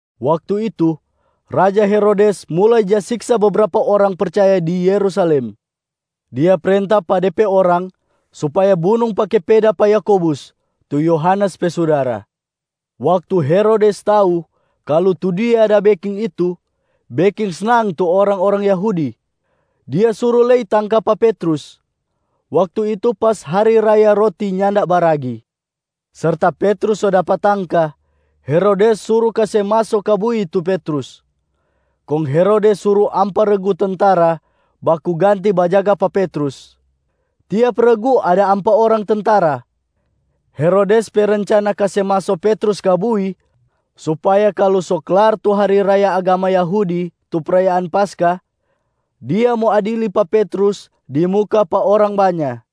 Waktu itu, raja Herodes mulai ja siksa bebrapa orang percaya di Yerusalem. Dia prenta pa de pe orang supaya bunung pake peda pa Yakobus, tu Yohanes pe sudara. Waktu Herodes tau kalu tu dia da beking itu beking snang tu orang-orang Yahudi, dia suru lei tangka pa Petrus. Waktu itu pas hari raya Roti Nyanda Baragi. Serta Petrus so dapa tangka, Herodes suru kase maso ka bui tu Petrus. Kong Herodes suru ampa regu tentara baku ganti bajaga pa Petrus. Tiap regu ada ampa orang tentara. Herodes pe rencana kase maso Petrus ka bui supaya kalu so klar tu hari raya agama Yahudi tu prayaan Paskah, dia mo adili pa Petrus di muka pa orang banya.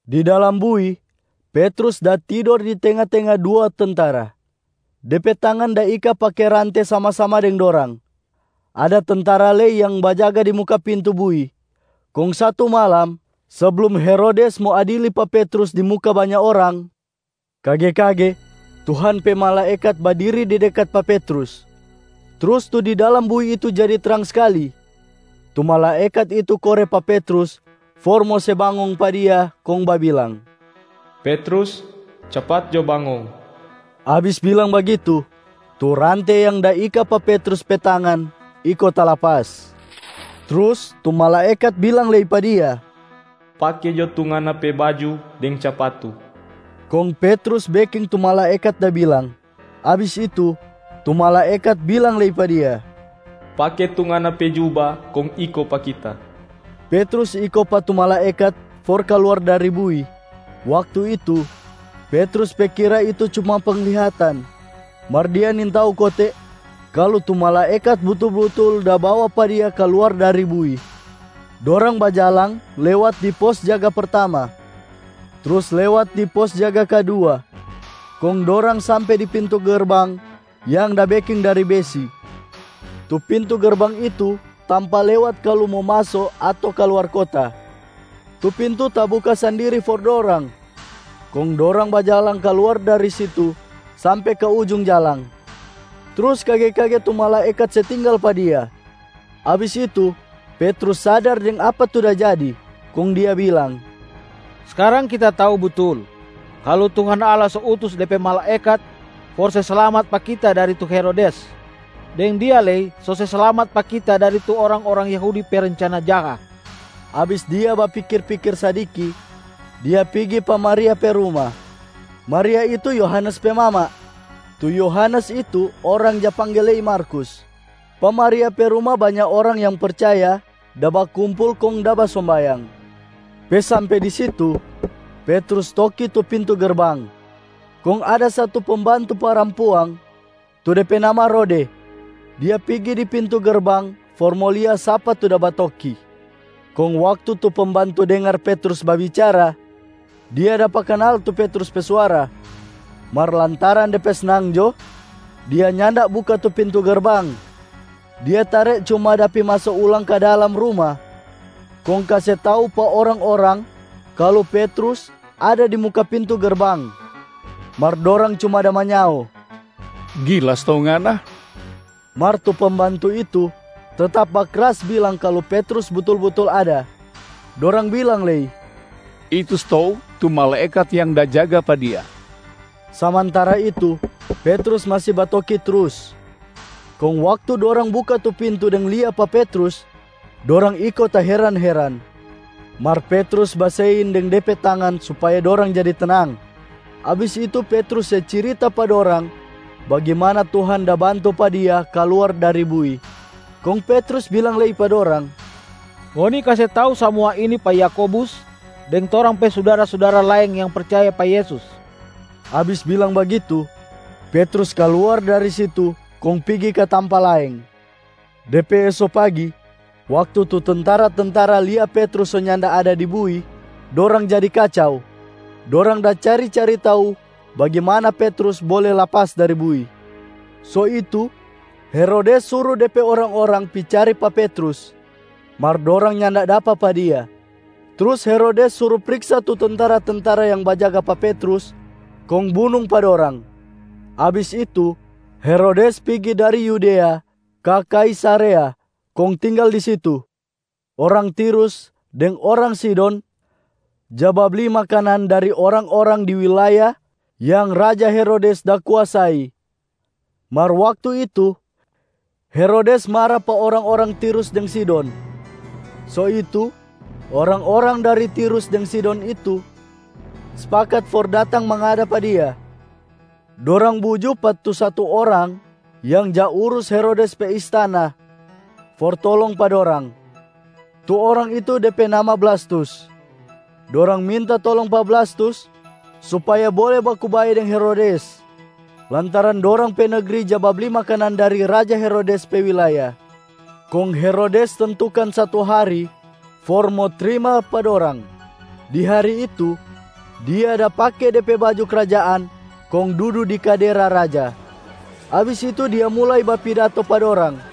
Di dalam bui, Petrus da tidor di tenga-tenga dua tentara, de pe tangan da ika pake rante sama-sama deng dorang. Ada tentara lei yang bajaga di muka pintu bui. Kong satu malam, seblum Herodes mo adili pa Petrus di muka banya orang, kage-kage Tuhan pe malaekat badiri di dekat pa Petrus. Trus tu di dalam bui itu jadi trang skali. Tu malaekat itu kore pa Petrus for mo se bangong pa dia kong babilang, “Petrus, capat jo bangong!” Abis bilang bagitu, tu rante yang da ika pa Petrus pe tangan iko talapas. Trus tu malaekat bilang lei pa dia, “Pake jo tu ngana pe baju deng capatu.” Kong Petrus beking tu malaekat da bilang. Abis itu, tu malaekat bilang lei pa dia, “Pake tu ngana pe juba kong iko pa kita.” Petrus iko pa tu malaekat for kaluar dari bui. Waktu itu, Petrus pe kira itu cuma penglihatan, mar dia nintau kote kalu tu malaekat butul-butul da bawa pa dia kaluar dari bui. Dorang bajalang lewat di pos jaga pertama, trus lewat di pos jaga kadua kong dorang sampe di pintu gerbang yang da beking dari besi. Tu pintu gerbang itu tampa lewat kalu mo maso ato kaluar kota. Tu pintu tabuka sandiri for dorang, kong dorang bajalang kaluar dari situ sampe ka ujung jalang, trus kage-kage tu malaekat se tinggal pa dia. Abis itu Petrus sadar deng apa tu da jadi, kong dia bilang, “Skarang kita tau butul kalu Tuhan Allah so utus De pe malaekat for se slamat pa kita dari tu Herodes, deng dia lei so se slamat pa kita dari tu orang-orang Yahudi pe rencana jaha.” Abis dia bapikir-pikir sadiki, dia pigi pa Maria pe ruma. Maria itu Yohanes pe mama, tu Yohanes itu orang ja pangge lei Markus. Pa Maria pe ruma, banya orang yang percaya da bakumpul kong da basombayang. Pe sampe di situ, Petrus toki tu pintu gerbang. Kong ada satu pembantu parampuang, tu de pe nama Rode. Dia pigi di pintu gerbang for mo lia sapa tu da batoki. Kong waktu tu pembantu dengar Petrus babicara, dia dapa kanal tu Petrus pe suara. Mar lantaran de pe snang jo, dia nyanda buka tu pintu gerbang. Dia tare cuma da pi maso ulang ka dalam ruma kong kase tau pa orang-orang kalu Petrus ada di muka pintu gerbang. Mar dorang cuma da manyao, “Gila stou ngana!” Mar tu pembantu itu tetap bakras bilang kalu Petrus butul-butul ada. Dorang bilang lei, “Itu stou tu malaekat yang da jaga pa dia.” Samantara itu Petrus masi batoki trus. Kong waktu dorang buka tu pintu deng lia pa Petrus, dorang iko taheran-heran. Mar Petrus basein deng de pe tangan supaya dorang jadi tenang. Abis itu Petrus se cirita pa dorang bagimana Tuhan da bantu pa dia kaluar dari bui. Kong Petrus bilang lei pa dorang, “Ngoni kase tau samua ini pa Yakobus deng torang pe sudara-sudara laeng yang percaya pa Yesus.” Abis bilang bagitu, Petrus kaluar dari situ kong pigi ka tampa laeng. De pe eso pagi, waktu tu tentara-tentara lia Petrus so nyanda ada di bui, dorang jadi kacau. Dorang da cari-cari tau bagimana Petrus bole lapas dari bui. So itu Herodes suru de pe orang-orang pi cari pa Petrus, mar dorang nyanda dapa pa dia. Trus Herodes suru priksa tu tentara-tentara yang bajaga pa Petrus kong bunung pa dorang. Abis itu, Herodes pigi dari Yudea ka Kaisarea kong tinggal di situ. Orang Tirus deng orang Sidon ja babli makanan dari orang-orang di wilaya yang raja Herodes da kuasai. Mar waktu itu, Herodes mara pa orang-orang Tirus deng Sidon. So itu, orang-orang dari Tirus deng Sidon itu spakat for datang mangada pa dia. Dorang buju pa tu satu orang yang ja urus Herodes pe istana for tolong pa dorang. Tu orang itu de pe nama Blastus. Dorang minta tolong pa Blastus supaya bole baku bae deng Herodes, lantaran dorang pe negri ja babli makanan dari raja Herodes pe wilaya. Kong Herodes tentukan satu hari for mo trima pa dorang. Di hari itu, dia da pake de pe baju krajaan kong dudu di kadera raja. Abis itu dia mulai bapidato pa dorang.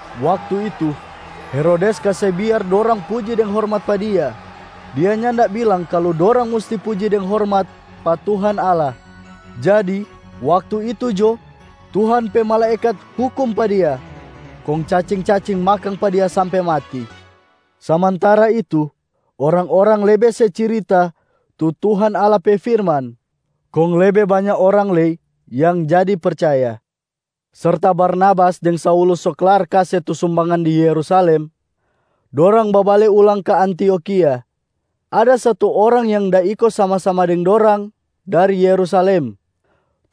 Waktu itu Herodes kase biar dorang puji deng hormat pa dia, dia nyanda bilang kalu dorang musti puji deng hormat pa Tuhan Allah. Jadi waktu itu jo Tuhan pe malaekat hukum pa dia, kong cacing-cacing makang pa dia sampe mati. Samantara itu, orang-orang lebe se cirita tu Tuhan Allah pe firman kong lebe banya orang lei yang jadi percaya. Serta Barnabas deng Saulus so klar kase tu sumbangan di Yerusalem, dorang babale ulang ka Antiokhia. Ada satu orang yang da iko sama-sama deng dorang dari Yerusalem,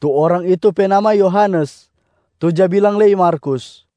tu orang itu pe nama Yohanes, tu ja bilang lei Markus.